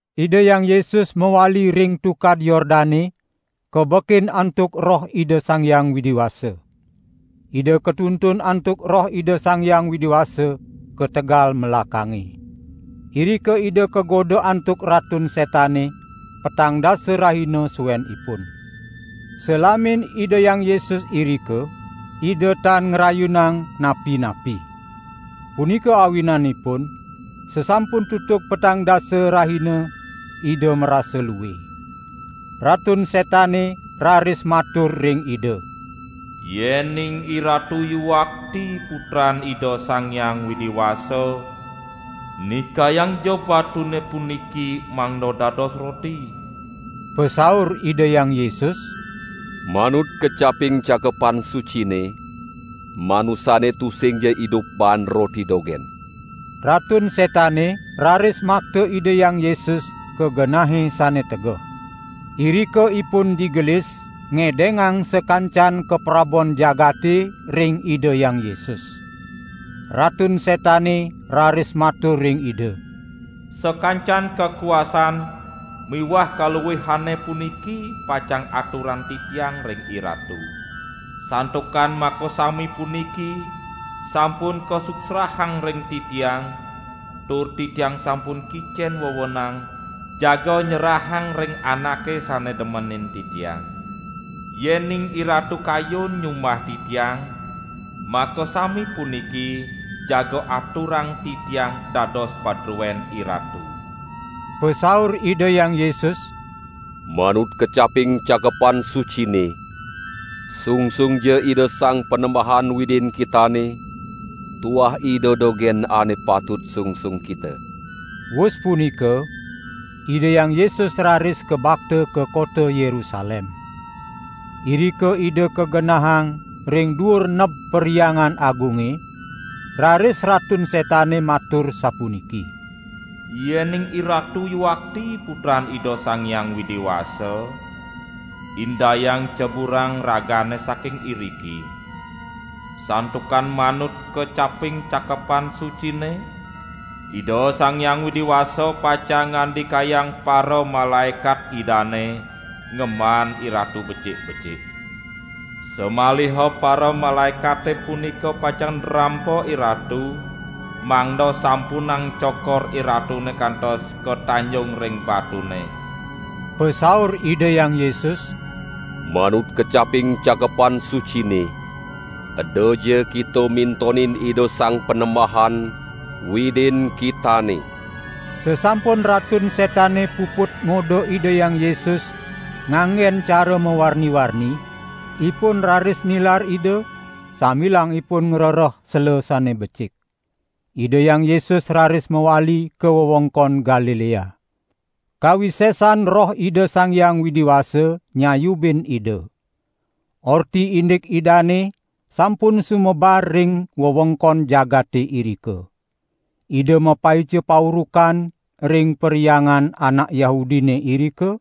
Ida Hyang Yesus mawali ring Tukad Yordane kabekin antuk Roh Ida Sang Hyang Widi Wasa. Ida katuntun antuk Roh Ida Sang Hyang Widi Wasa ka tegal melakange. Irika Ida kagoda antuk Ratun Setane petang dasa rahina suenipun. Salamin Ida Hyang Yesus irika, Ida tan ngrayunang napi-napi. Punika awinanipun sasampun tutug petang dasa rahina Ida marasa lue. Ratun Setane raris matur ring Ida: "Yening IRatu yuakti Putran Ida Sang Hyang Widi Wasa, nikayangja batune puniki mangda dados roti." Pasaur Ida Hyang Yesus: "Manut kecaping Cakepan Sucine, manusane tusingja idup baan roti dogen." Ratun Setane raris makta Ida Hyang Yesus ka genahe sane tegeh. Irika ipun digelis ngedengang sakancan kaprabon jagate ring Ida Hyang Yesus. Ratun Setane raris matur ring Ida: "Sakancan kakuasaan miwah kaluihane puniki pacang aturang titiang ring IRatu. Santukan makasami puniki sampun kasuksrahang ring titiang, tur titiang sampun kicen wewenang jaga nyerahang ring anake sane demenin titiang. Yening IRatu kayun nyumbah titiang, makasami puniki jaga aturang titiang dados padruen IRatu." Pasaur Ida Hyang Yesus: "Manut kecaping Cakepan Sucine: Sungsungja Ida Sang Panembahan Widin kitane, tuah Ida dogen ane patut sungsung kita." Wus punika Ida Hyang Yesus raris kabakta ka kota Yerusalem. Irika Ida kagenahang ring duur neb Perhyangan Agunge, raris Ratun Setane matur sapuniki: "Yening IRatu yuakti Putran Ida Sang Hyang Widi Wasa, indayang ceburang Ragane saking iriki. Santukan manut kecaping Cakepan Sucine, Ida Sang Hyang Widi Wasa pacang ngandikayang paramalaekat Idane ngemban IRatu becik-becik. Samaliha paramalaekate punika pacang nrampa IRatu, mangda sampunang cokor IRatune kantos katanjung ring batune." Pasaur Ida Hyang Yesus: "Manut kecaping Cakepan Sucine: Edaja kita mintonin Ida Sang Panembahan, Widin kitane." Sasampun Ratun Setane puput ngoda Ida Hyang Yesus nganggen cara mawarni-warni, ipun raris nilar Ida, sambilang ipun ngrereh sela sane becik. Ida Hyang Yesus raris mawali ka wewengkon Galilea. Kawisesan Roh Ida Sang Hyang Widi Wasa nyayubin Ida. Orti indik Idane sampun sumebar ring wewengkon jagate irika. Ida mapaica paurukan ring perhyangan anak Yahudine irika,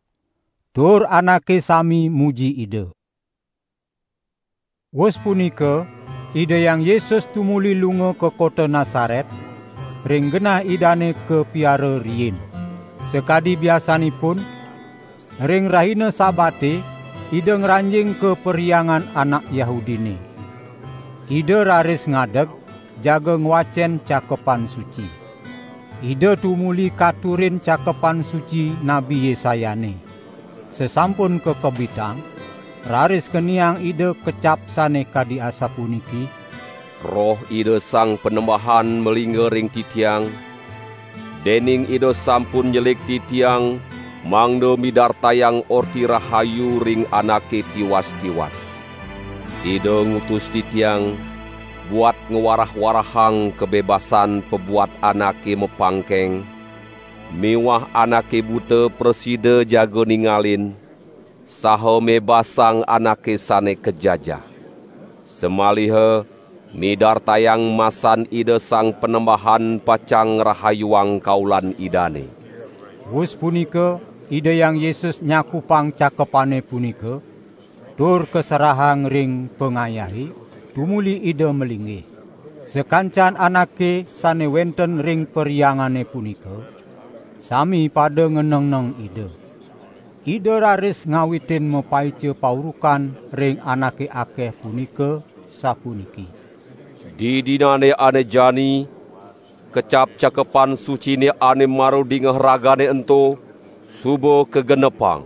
tur anake sami muji Ida. Wus punika Ida Hyang Yesus tumuli lunga ka kota Nasaret, ring genah Idane kapiara riin. Sakadi biasanipun, ring rahina Sabate Ida ngranjing ka Perhyangan anak Yahudine. Ida raris ngadeg jaga ngwacen Cakepan Suci. Ida tumuli katurin Cakepan Suci Nabi Yesayane. Sasampun kakebitang raris keniang Ida kecap sane kadi asapuniki: "Roh Ida Sang Panembahan malingga ring Titiang, dening Ida sampun nyelik Titiang mangda midartayang Orti Rahayu ring anake tiwas-tiwas. Ida ngutus Titiang buat ngwarah-warahang kabebasan pabuat anake mapangkeng miwah anake buta prasida jaga ningalin, saha mebasang anake sane kajajah. Samaliha midartayang masan Ida Sang Panembahan pacang ngrahayuang kaulan Idane." Wus punika Ida Hyang Yesus nyakupang cakepane punika, tur kaserahang ring pangayahe, tumuli Ida malinggih. Sakancan anake sane wenten ring perhyangane punika, sami pada nganengneng Ida. Ida raris ngawitin mapaica paurukan ring anake akeh punika, sapuniki: "Didinane ane jani kecap Cakepan Sucine ane mara dingeh ragane ento suba kagenepang."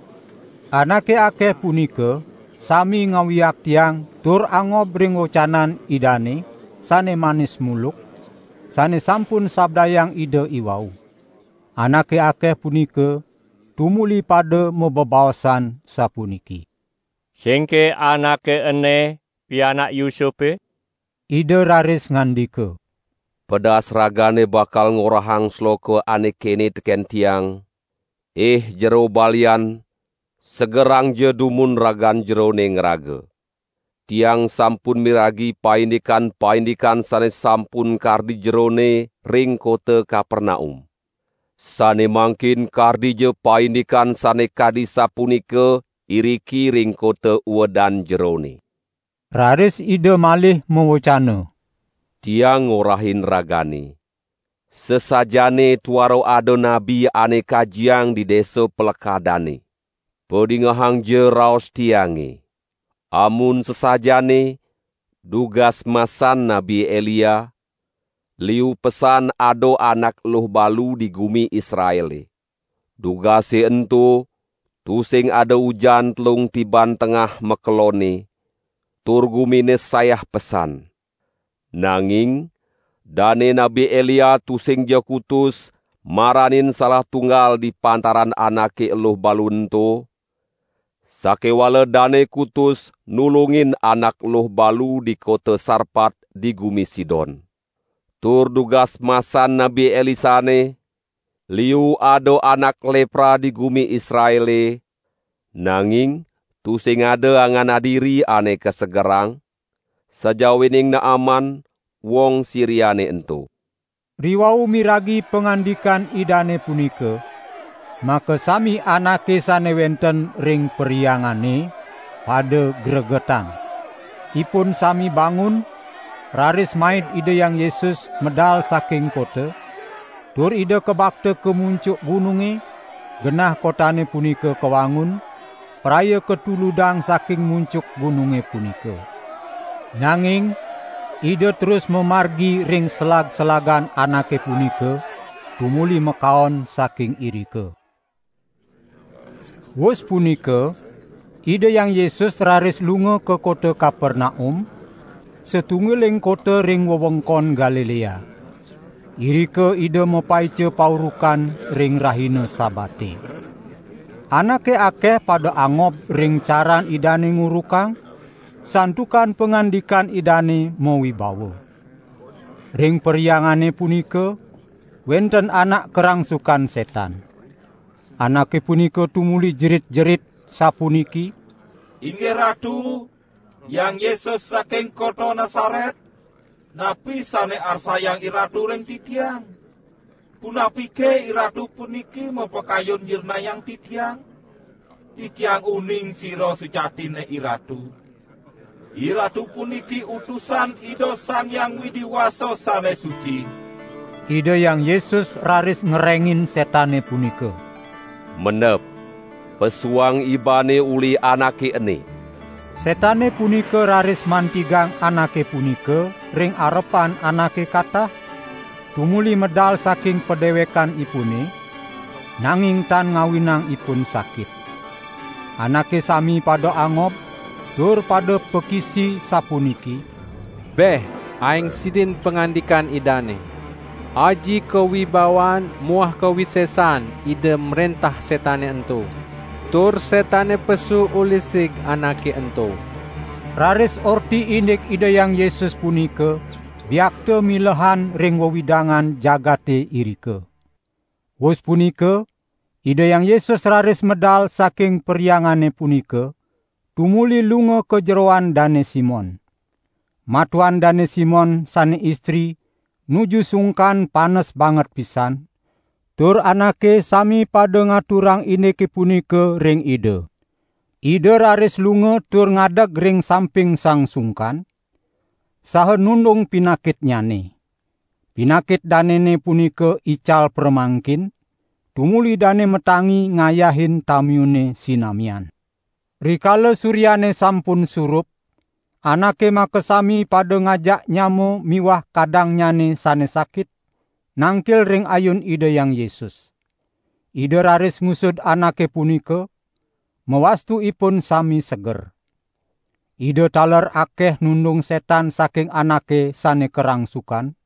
Anake akeh punika sami ngawiaktiang tur angob ring wecanan Idane sane manis muluk, sane sampun sabdayang Ida iwau. Anake akeh punika tumuli pada mabebaosan, sapuniki: "Singke Anake ene pianak Yusupe?" Ida raris ngandika: "Pedas ragane bakal ngorahang sloka ane kene teken Tiang: Ih jero balian segerangja dumun ragan Jerone ngraga. Tiang sampun miragi paindikan-paindikan sane sampun kardi jerone ring kota Kapernaum. Sane mangkin kardija paindikan sane kadi sapunika iriki ring kota uedan Jerone." Raris Ida malih mawecana: "Tiang ngorahin ragane, sasajaane tuara ada nabi ane kajiang di desa palekadanne. Padingehangja raos Tiange. Amun sasajaane, dugas masan Nabi Elia, liu pesan ada anak eluh balu di gumi Israele. Dugase ento tusing ada ujan telung tiban tengah makelonne, tur gumine sayah pesan. Nanging dane Nabi Elia tusingja kutus maranin salah tunggal di pantaran anake eluh balu ento, sakewala dane kutus nulungin anak eluh balu di kota Sarpat di gumi Sidon. Tur dugas masan Nabi Elisane, liu ada anak lepra di gumi Israele, nanging tusing ada angan adiri ane kasegerang, sajawining Naaman, wong Siriane ento." Riwau miragi pangandikan Idane punika, makasami anake sane wenten ring perhyangane pada gregetan. Ipun sami bangun, raris maid Ida Hyang Yesus medal saking kota, tur Ida kabakta ka muncuk gununge, genah kotane punika kawangun, praya katuludang saking muncuk gununge punika. Nanging Ida terus mamargi ring selag-selagan anake punika tumuli makaon saking irika. Wus punika Ida Hyang Yesus raris lunga ka kota Kapernaum, satunggiling kota ring wewengkon Galilea. Irika Ida mapaica paurukan ring rahina Sabate. Anake akeh pada angob ring caran Idane ngurukang, santukan pangandikan Idane mawibawa. Ring perhyangane punika wenten anak karangsukan setan. Anake punika tumuli jerit-jerit sapuniki: "Inggih Ratu, Hyang Yesus saking kota Nasaret, napi sane arsayang IRatu ring titiang? Punapike IRatu puniki mapakayun nyirnayang titiang? Titiang uning sira sujatinne IRatu: IRatu puniki Utusan Ida Sang Hyang Widi Wasa sane suci!" Ida Hyang Yesus raris ngerengin setane punika: "Mendep, pesuang ibane uli anake ene!" Setane punika raris mantigang anake punika ring arepan anake katah, tumuli medal saking padewekanipune, nanging tan ngawinang ipun sakit. Anake sami pada angob, tur pada pakisi sapuniki: "Beh, aeng sidin pangandikan Idane. Aji kawibawan muah kawisesan Ida mrentah setane ento, tur setane pesu uli sig anake ento." Raris orti indik Ida Hyang Yesus punika biakta milehan ring wewidangan jagate irika. Wus punika Ida Hyang Yesus raris medal saking perhyangane punika, tumuli lunga ka jeroan Dane Simon. Matuan Dane Simon sane istri nuju sungkan panes banget pisan, tur anake sami pada ngaturang indike punika ring Ida. Ida raris lunga tur ngadeg ring samping sang sungkan, saha nundung pinakitnyane. Pinakit danene punika ical pramangkin, tumuli dane matangi ngayahin tamiune sinamian. Rikala suryane sampun surup, anake makasami pada ngajak nyama miwah kadangnyane sane sakit, nangkil ring ayun Ida Hyang Yesus. Ida raris ngusud anake punika, mawastu ipun sami seger. Ida taler akeh nundung setan saking anake sane karangsukan,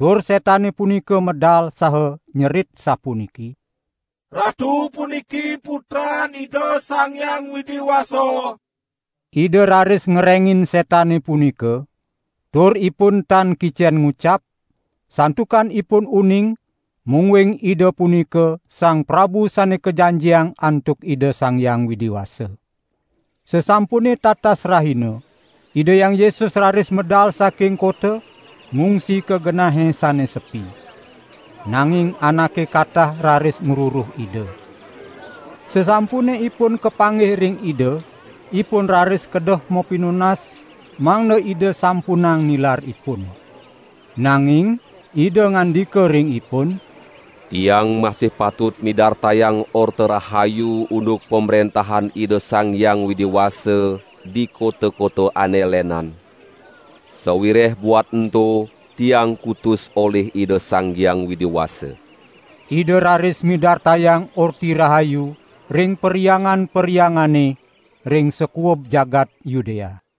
tur setane punika medal saha nyerit sapuniki: "Ratu puniki Putran Ida Sang Hyang Widi Wasa!" Ida raris ngerengin setane punika, tur ipun tan kicen ngucap, santukan ipun uning mungguing Ida punika Sang Prabu Sane Kajanjiang antuk Ida Sang Hyang Widi Wasa. Sasampune tatas rahina Ida Hyang Yesus raris medal saking kota, ngungsi ka genahe sane sepi. Nanging anake katah raris ngruruh Ida. Sasampune ipun kapanggih ring Ida ipun raris kedeh mapinunas mangda Ida sampunang nilar ipun. Nanging Ida ngandika ring ipun: "Tiang masih patut midartayang Orta Rahayu unduk Pamrentahan Ida Sang Hyang Widi Wasa di kota-kota ane lenan; sawireh buat ento Tiang kutus olih Ida Sang Hyang Widi Wasa." Ida raris midartayang Orti Rahayu ring perhyangan-perhyangane ring sakuub jagat Yudea.